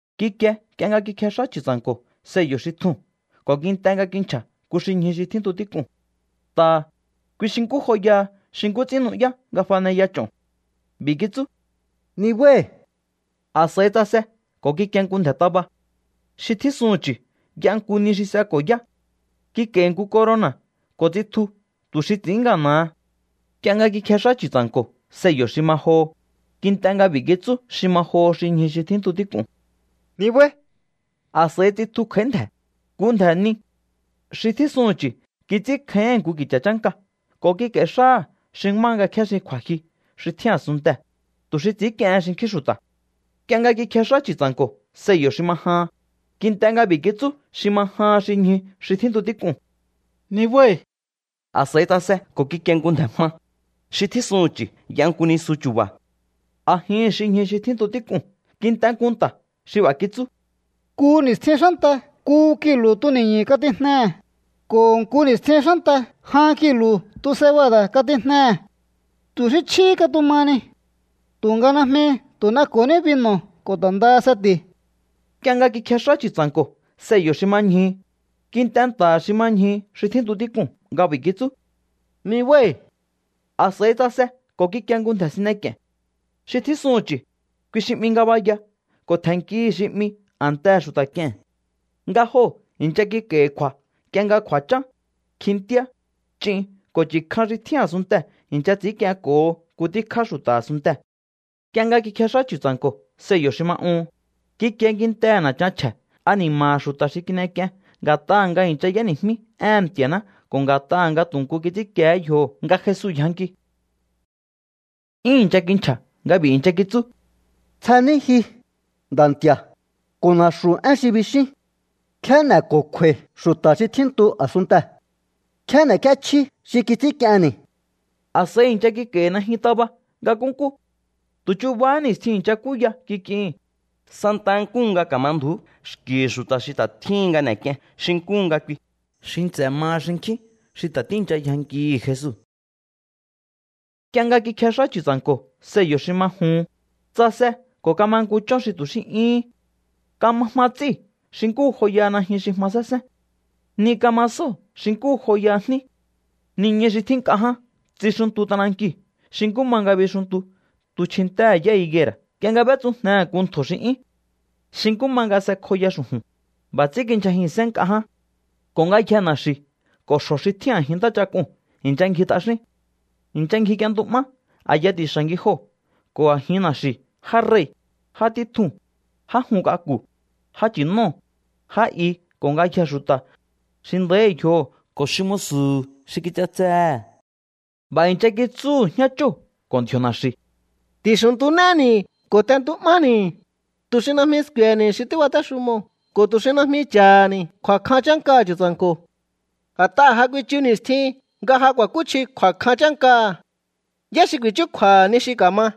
Kikie nk'ie nga kikjex'á Chu̱tsa̱nko̱ sello̱ xi tjuu̱n ko̱ kint'e nga kinchja̱ nku xi ñju xi tjíntu tík'uu̱n. Nta̱ha̱, kui xi nkú joyaha xi nkú ts'ín nu'yá nga faneya ch'o̱n. B'i̱ kitsú: —¡Nibái̱! A̱s'a̱i tsase ko̱ kikie nku ndje̱ taba. Xi tjísuhu̱n chu̱ y'a nku ni xi s'eko̱ yá. Kik'a̱i̱hi̱ nku corona̱ ko̱ tsitju tu̱ xi ts'i̱ín ngana̱ha. Nk'ie nga kikjex'á Chu̱tsa̱nko̱ sello̱ xi ma joho, kint'e nga b'i̱ kitsú xi ma joho xi ñju xi tjíntu tík'uu̱n: —¡Nibái̱! A̱s'a̱i tsitju kj'a̱í ndje̱, nku ndje̱ ni. Xi tjísuhu̱n chu̱ kits'ínkjáíhi̱n nku ki̱cha̱ chánka ko̱ kik'a̱i̱ xáha̱ xi má nga kjéxin kju̱a̱jyu xi tjín a̱sunntee̱, tu̱ xi ts'i̱ínk'iehen xinkjín xu̱ta̱. Nk'ie nga kikjex'á Chu̱tsa̱nko̱ sello̱ xi ma jahan, kint'e nga b'i̱ kitsú xi ma jahan xi ñju xi tjíntu tík'uu̱n: —¡Nibái̱! A̱s'a̱i tsase ko̱ kikie nku ndje̱ jma. Xi tjísuhu̱n chu̱ y'a nku nisuchúba̱. A̱jihi̱n xi ñju xi tjíntu tík'uu̱n kint'e nku nta̱ xi b'a̱ kitsú: —Nku ni̱stjin xánta nku kilu̱ tuni̱ñu̱ katijnehe̱, ko̱ nku ni̱stjin xánta jan kilu̱ tu cebada̱ katijnehe̱. Tu̱ xí chjíhí katuma ni. Tu̱nga najmi tu̱ n'eko̱ní binu̱ ko̱ ta̱ ndaha seti̱u̱. Nk'ie nga kikjex'á Chu̱tsa̱nko̱ sello̱ xi ma ñjuhu, kint'e nta̱ha̱ xi ma ñjuhu xi tjíntu tík'uu̱n nga b'i̱ kitsú: —¡Nibái̱! A̱s'a̱i tsase ko̱ kikie nku ndje̱ sine k'i̱e̱n. Xi tjísuhu̱n chu̱, kui xi 'mi Ngabaya ko̱ tje̱nnkihi̱ xi 'mi A̱ntehe̱ Xu̱ta̱ K'ie̱n. Nga joo̱ i̱ncha kik'a̱i̱hi̱ kju̱a̱ nk'ie nga kju̱a̱chán, kjintíá, ch'in ko̱ chu̱ kjan xi tjín a̱sunntee̱ i̱ncha ts'i̱ínk'ienko̱ho nku tíkjá xu̱ta̱ a̱sunntee̱. Nk'ie nga kikjex'á Chu̱tsa̱nko̱ sello̱ xi ma uhun, kikie kintehe̱ na̱chan chje̱ ani̱ma̱ha̱ xu̱ta̱ xi kin'ek'ien nga̱t'aha̱ nga i̱ncha y'éni̱jmí éhe̱n Nti̱a̱ná ko̱ nga̱t'aha̱ nga tu̱ nku kits'ínkiehé yjoho̱ nga Jesu yjanki. 'Yún i̱ncha kinchja̱ nga b'i̱ i̱ncha kitsú: —Tsjení ji, Nda̱ Nti̱a̱, ko̱ na̱xu̱ én xi bixín. ¿Nkjé n'e̱ko̱kju̱a̱i̱ xu̱ta̱ xi tjíntu a̱sunntee̱? ¿Nkjé n'e̱k'íéchjí xi kits'ínk'ienni̱? A̱s'a̱i i̱ncha kik'a̱i̱hi̱ najyun taba nga nkúnkú. Tu̱ chubahá ni̱stjin i̱ncha kúya kik'ihi̱n, santaha nkúhu nga ka̱ma ndju̱ú xki̱hi̱ xu̱ta̱ xi ta̱ tjíhin nga n'e̱k'ien xi nkúhu nga kui, xi nts'e̱ maha xinkjín xi ta̱ tíi̱ncha yjankihi̱ Jesu. Nk'ie nga kikjex'á Chu̱tsa̱nko̱ sello̱ xi ma juhun, tsase ko̱ kama nku chón xi tu̱ xí 'yúhún. Kama jma ts'íu̱ xi nkú joyaha najyun xi jma sénsén. Ni kama sóo̱ xi nkú joyaha jní. Niñu xi tjín nk'a ján tsixuntu t'anankiu̱ xi nkú ma nga bixuntu tu chjintéhe̱ yá higuera̱ nk'ie nga b'étsujnehe̱ nku ntjo̱ xi 'yún. Xi nkú ma nga s'ekjoya xu̱ju̱n, b'a̱ ts'ín kindyjajin sén nk'a ján. Ko̱ ngayjee̱ na̱xi̱u̱ ko̱ xjo̱ xi tjín a̱jin ntáchak'uu̱n i̱ncha ngji t'axín. I̱ncha ngjik'ientu'má a̱ya ti̱xa̱ ngijoo̱ ko̱ a̱jin na̱xi̱u̱ já rei̱, já títjuu̱n, já jun k'aku̱, já nchi̱nóo̱, já i ko̱ ngayjee̱ xu̱ta̱, xi nda̱íhi̱ yjoho̱ ko̱ xi musu̱hu̱ xi kich'atsehe̱. B'a̱ i̱ncha kitsúhu̱ jñáchóo̱ ko̱ ndji̱o̱ na̱xi̱u̱: —Ti̱xu̱ntunéni̱ ko̱ t'entu'máni̱, tu̱ xi najmi sku̱e̱he̱ni̱ xi tíbatéxumoo̱ ko̱ tu̱ xi najmi cha̱ha̱ni̱ kju̱a̱kjan chánkaha̱ Chu̱tsa̱nko̱. A̱t'aha̱ ja kuichu ni̱stjin nga ja ku̱a̱kúchji kju̱a̱kjan chánkaha̱. ¿Yá xi ku̱i̱chúkju̱a̱ha̱ ni xi ka̱ma?